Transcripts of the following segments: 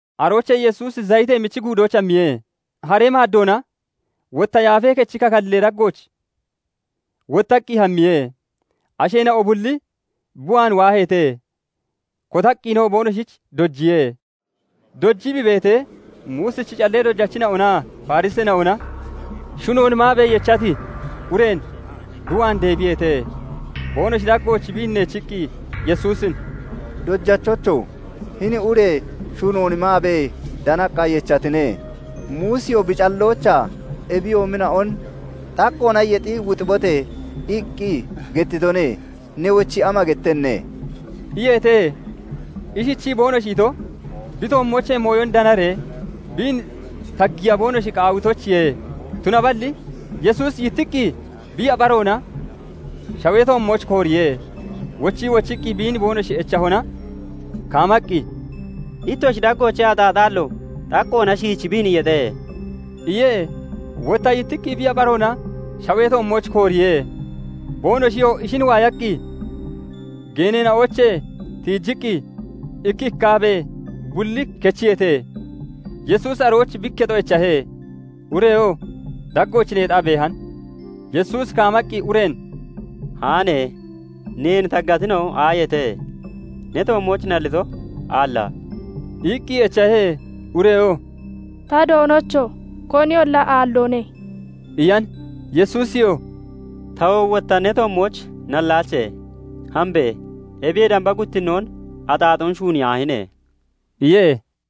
Aroochee Yesuusi Zayitee Michi Guudooch hammiye. Haree maaddoona wotta Yaafee Kechi kakallee daggooch wottaqqi hammiye. Asheena'o bulli bi waan waaheete. Kotaqqinoo boonoshich dojiye. Dojii bi beetee, Muusichi callee dojachina'onaa Fariseena'ona shunoon maabee yechati ureen bi waan deebiyeete; boonoshi daggooch biin neechiqqi, Yesuusin "Dojachocho! Hini ure shunoon maabee danaqqa yechatine. Muusiyoo bi calloochaa ebiyoomina'on 'Xaqqoona yexi wuxibote!' iqqi gettitone. Newochi ama gettenne?" iyeete. Ishichii boonoshi ito, bi toommoochee mooyon danaree biin taggiya boonoshi qaawitoyichiye. Tunaballi Yesuusi yittiqqi bi yapharoona (yabaroona) shawee toommooch kooriye. Wochii wochiqqi biin boonoshi echahona, kaamaqqi, "Ittoshi daggoochee axaaxaallo xaqqoona shiichi biin yexe" iye. Wotta yittiqqi bi yapharoona (yabaroona) shawee toommooch kooriye. Boonoshiyoo ishin waayaqqi geeneena'oochee tiijiqqi ikki iqqaabee bulli kechiyeete. Yesuusi arooch bi ikketo echahe; ureyoo daggooch neexaa beehan. Yesuusi kaamaqqi ureen "Haane! Neen taggatina'o aayeete? Ne toommooch nallito aalla?" iqqi echahe. Ureyoo "Ta Doonocho! Koniyolla aalloone" iyan. Yesuusiyoo "Tawo wotta ne toommooch nallaache. Hambe! Ebiyee damba guttinnoon axaaxoon shuuniyaahine!" iye.]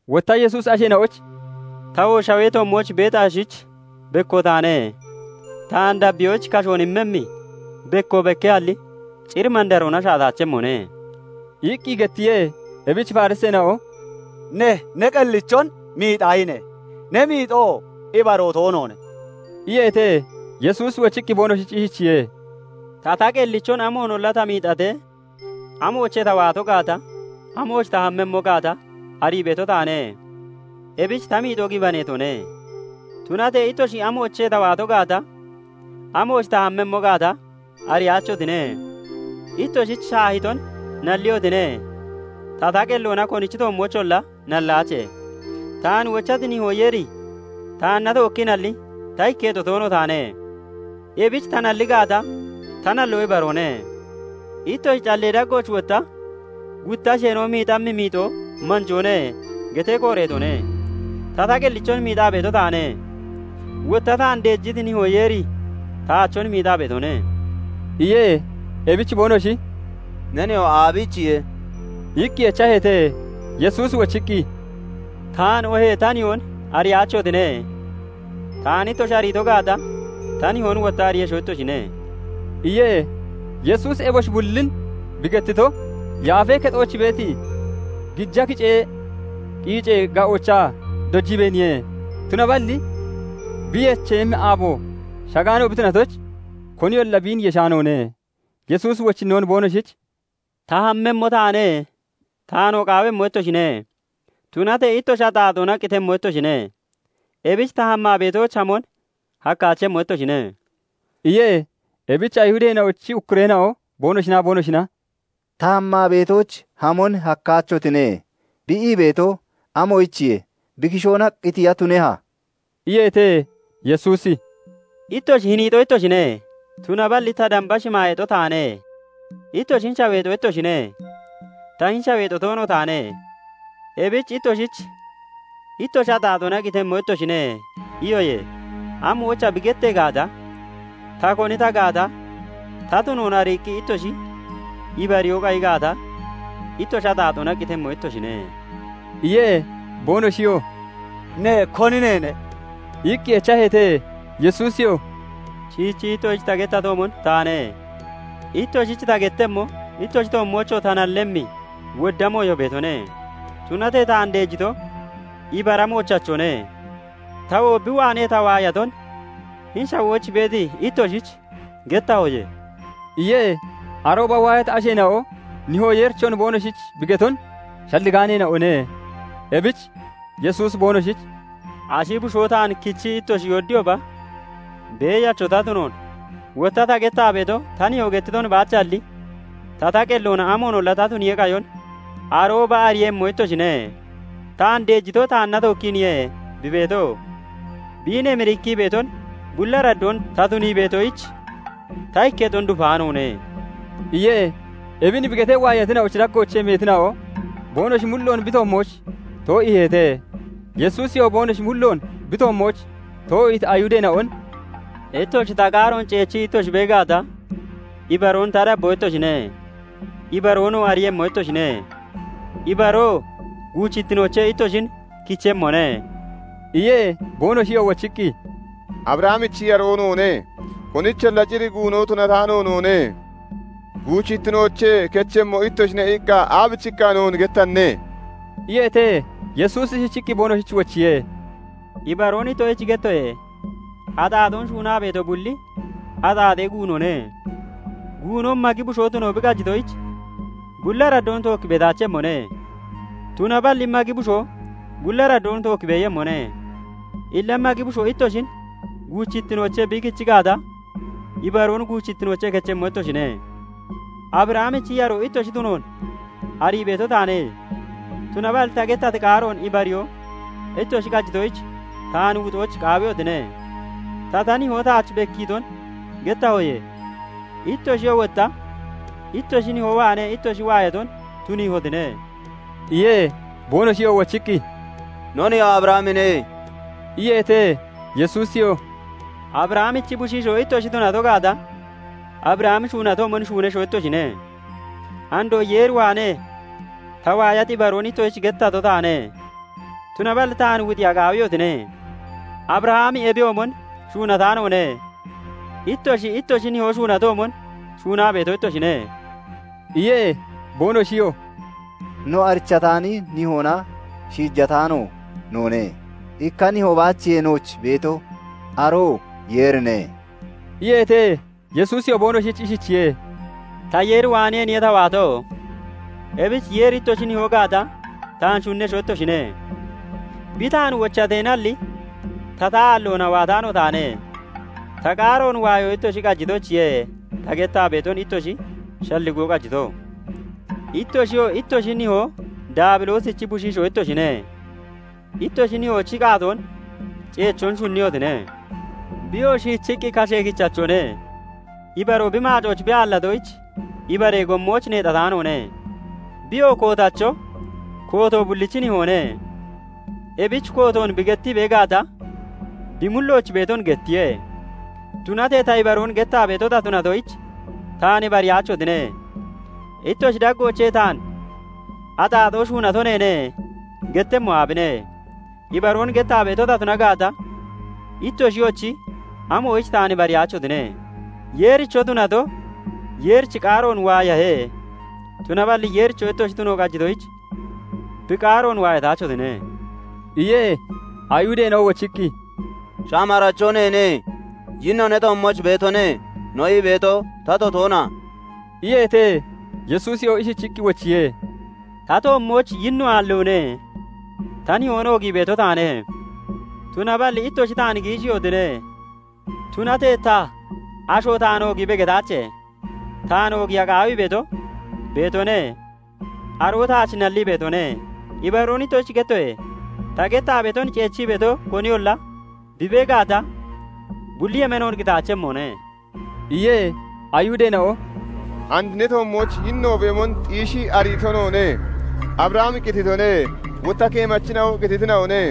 Wotta Yesuusi asheena'oyich "Tawoo shawee toommooch beeti ashich bekko taane; taan dabbiyoyich kashoon immemmi bekko bekkehalli, cir mandaroona sha'ataachemmone" iqqi gettiye. Ebich Fariseena'o "Ne, ne qellichon miixahine; ne miixo ibaroo toonoone" iyeete. Yesuusi wochiqqi boonoshich ishichiye:- "Ta, ta qellichon amoonolla ta miixatee, amoochee ta waato gaata, amooch ta hammemmo gaata arii beeto taane; ebich ta miixo gibaneetone. Tunatee ittoshi amoochee ta waato gaata, amooch ta hammemmo gaata ariyaachotine. Ittoshich shaahiton nalliyotine; ta, ta qelloona konichi toommoocholla nallaache. Taan wochati Nihoo Yeeri taanna tookkiinalli ta ikketo toono taane; ebich ta nalli gaata, ta nalloo ibaroone. Ittoshi callee daggooch wotta 'Gutta asheena'o miixammi miixo manjoone' getee kooreetone. Ta, ta qellichon miixaa beeto taane; wotta taan deejiti Nihoo Yeeri taachon miixaa beetone" iye. Ebich boonoshi "Ne nihoo aabiichiye?" iqqi echaheete. Yesuusi wochiqqi, "Taan, oohee ta Nihoon ariyaachotine. Taan ittoshi ariito gaata, ta Nihoon wotta ariiyesho ittoshine" iye. Yesuusi eboshi bullin bi gettito, Yaafee Kexooch beeti gija kicee qiicee ga'oochaa dojiibeeniye. Tunaballi bi yecheeyemmi aabo shagaano bi tunatoyich, koniyolla biin yeshaanoone. Yesuusi wochinnoon boonoshich "Ta hammemmo taane. Taanoo qaawemmo ittoshine; tunatee ittoshi axaaxoona qitemmo ittoshine. Ebich ta hammaa beetooch hamon hakkaachemmo ittoshine" iye. Ebich Ayihudeena'ochi ukkureena'o boonoshinaa boonoshina " 'Ta hammaa beetooch hamon hakkaachotine' bi ii beeto, amoyichiye? Bi kishoona qitiya tuneha?" iyeete. Yesuusi "Ittoshi hiniixo ittoshine; tunaballi ta damba shimaayeexo taane. Ittoshi hini shaweexo ittoshine; ta hini shaweexo toono taane. Ebich ittoshich 'Ittoshi axaaxoona qitemmo ittoshine' iyoye; 'Amoyicha?' bi gettee gaata, ta koni ta gaata ta tunoon ariiqqi ittoshi ibariyoo qayi gaata, ittoshi axaaxoona qitemmo ittoshine" iye. Boonoshiyoo "Ne koni neene?" iqqi echaheete. Yesuusiyoo "Shiichii ittoshich ta gettatoomon taane. Ittoshich ta gettemmo, ittoshi toommoochoo ta nallemmi wodda mooyo beetone; tunatee taan deejito ibara moochachone; tawoo bi waanee ta waayaton hini shawooch beeti ittoshich gettahoye" iye. Arooba waayati asheena'o Nihoo Yeerichon boonoshich bi geton shalligaaneena'one. Ebich Yesuusi boonoshich "Ashi Bushoo taan kichii ittoshi yoodiyooba, beeyacho ta tunoon, wotta ta gettaa beeto ta Nihoo gettiton baachalli, ta qelloona amoonolla ta tuniyee qayon arooba ariiyemmo ittoshine. Taan deejito taanna tookkiiniye bi beeto; biin emirikkii beeton bulli araddoon ta tunii beetoyich, ta ikketon dufaanoone" iye. Ebin bi getee, waayatina'ochi daggoochee meetina'o boonoshi mulloon bi toommooch too'iiheete. Yesuusiyoo boonoshi mulloon bi toommooch too'iiti Ayihudeena'on "Ittoshi ta qaaroon ceechii ittoshi bee gaata, ibaroon ta dabboo ittoshine; ibaroonoo ariiyemmo ittoshine; ibaroo guuchittinoochee ittoshin kichemmone" iye. Boonoshiyoo wochiqqi, "Abrahamichi yaroo noone; konicholla cir guuno tunataano noone. 'Guuchittinoochee kechemmo ittoshine' iqqa aabichiqqa noon gettanne?" iyeete. Yesuusi ishichiqqi boonoshich wochiye:- "Ibaroon ittoshich gettoye:- Axaaxoon shuunaa beeto bulli axaaxee guunone. Guuno magi bushoo tuno bi qajitoyich, bulli araddoon tookki beetaachemmone; tunaballi magi bushoo bulli araddoon tookki beeyemmone. Illa magi bushoo ittoshin guuchittinoochee bi kichi gaata, ibaroon guuchittinoochee kechemmo ittoshine. Abrahamichi yaroo ittoshi tunoon arii beeto taane; tunaballi ta gettati qaaroon ibariyoo ittoshi qajitoyich, taan wuxoyich qaawiyotine. Ta, ta Nihoo taach bekkiiton gettahoye; ittoshiyoo wotta ittoshi nihoo waanee ittoshi waayaton tuniihotine" iye. Boonoshiyoo wochiqqi, "No nihoo Abrahamine" iyeete. Yesuusiyoo "Abrahamichi bushiishoo ittoshi tunato gaata, Abrahami shuunatoomon shuunesho ittoshine. Andoo Yeer waanee ta waayati ibaroon ittoshich gettato taane; tunaballi taan wuxiya qaawiyotine. Abrahami ebiyoomon shuunataanoone. Ittoshi, ittoshi nihoo shuunatoomon shuunaa beeto ittoshine" iye. Boonoshiyoo "No arichataani nihoona shiijataano noone. Ikka Nihoo baachiye nooch beeto; aroo Yeerine" iyeete. Yesuusiyoo boonoshich ishichiye:- "Ta Yeer waaneeniye ta waato. Ebich Yeeri ittoshi Nihoo gaata, taan shunnesho ittoshine. Bi taan wochateenalli, ta, ta aalloona (ta qellee daaggoona) waataano taane. Ta qaaroon waayo ittoshi qajitoyichiye ta gettaa beeton ittoshi shalligoo qajito. Ittoshiyo, ittoshi nihoo Daabiloosichi bushiishoo ittoshine; ittoshi nihoochi qaatoon ceechoon shunniyotine. Biyoo shiichiqqi kashee kichachone; ibaroo bi maacooch bi aallatoyich, ibaree gommooch neexataanoone. Biyoo kootacho, kooto bullichi nihoone; ebich kootoon bi gettii bee gaata, bi mullooch beeton gettiye. Tunatee ta ibaroon gettaa beeto ta tunatoyich, taan ibariyaachotine. Ittoshi daggoochee taan 'Axaaxoon shuunato neene' gettemmo aabine? Ibaroon gettaa beeto ta tuna gaata, ittoshiyochi amoyich taan ibariyaachotine? Yeericho tunato, Yeerichi qaaroon waayahe; tunaballi Yeericho ittoshi tuno qajitoyich, bi qaaroon waayataachotine" iye. Ayihudeena'o wochiqqi, " 'Shamaaracho neene; yinnoo ne toommooch beetone' no ii beeto tato toona?" iyeete. Yesuusiyoo ishichiqqi wochiye:- "Ta toommooch yinno aalloone; ta Nihoon oogii beeto taane; tunaballi ittoshi taan giishiihotine. Tunatee ta 'Asho taan oogiibe' getaache; taan oogiiya qaawii beeto beetone; aroo taach nallii beetone. Ibaroon ittoshich gettoye:- Ta gettaa beeton ceechii beeto koniyolla bi bee gaata, bulli yemeenoon qitaachemmone" iye. Ayihudeena'o "And ne toommooch yinno beemon xiishii ariito noone. Abrahami qititone; wotta keemachina'oo qititina'one.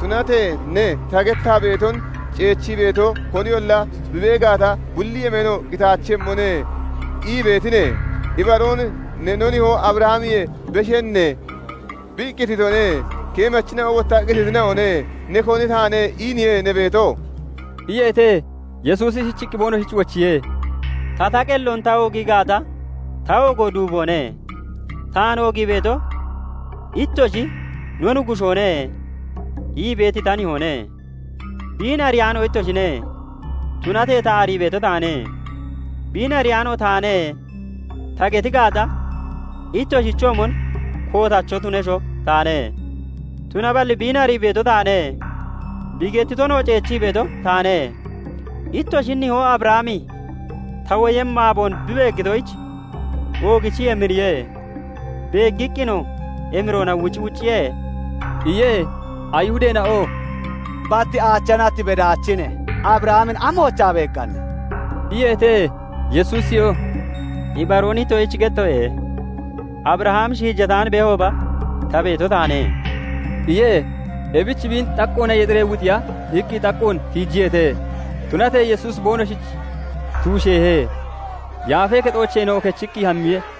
Tunatee ne 'Ta gettaa beeton ceechii beeto koniyolla bi bee gaata, bulli yemeenoon qitaachemmone' ii beetine. Ibaroon ne no nihoo Abrahamiyee beshenne? Bi qititone; keemachina'o wotta qititina'one; ne koni taane iiniye ne beeto?" iyeete. Yesuusi ishichiqqi boonoshich wochiye:- "Ta, ta qelloon ta oogii gaata ta oogo duuboone. Taan oogii beeto, ittoshi 'No Nuggushoone' ii beeti ta Nihoone. Biin ariyaano ittoshine; tunatee ta arii beeto taane. 'Biin ariyaano taane' ta geti gaata, ittoshichoomon kootacho tunesho taane; tunaballi biin arii beeto taane; bi gettitonoo ceechii beeto taane. Ittoshi nihoo Abrahami ta woyemmi aaboon bi beeggitoyich oogichii emiriye; beeggiqqinoo emiroona wucwucciye" iye. Ayihudeena'oo "Bat aacha nat bedaachine. Abrahamin amoochaa beegganne?" iyeete. Yesuusiyoo "Ibaroon ittoshich gettoye; Abrahami shiijataan beehooba, ta beeto taane" iye. Ebich biin xaqqoona yexiree wuxiya iqqi xaqqoon tiijiyeete. Tunatee Yesuusi boonoshich tuusheehe; Yaafee Kexoocheenoo kechiqqi hammiye.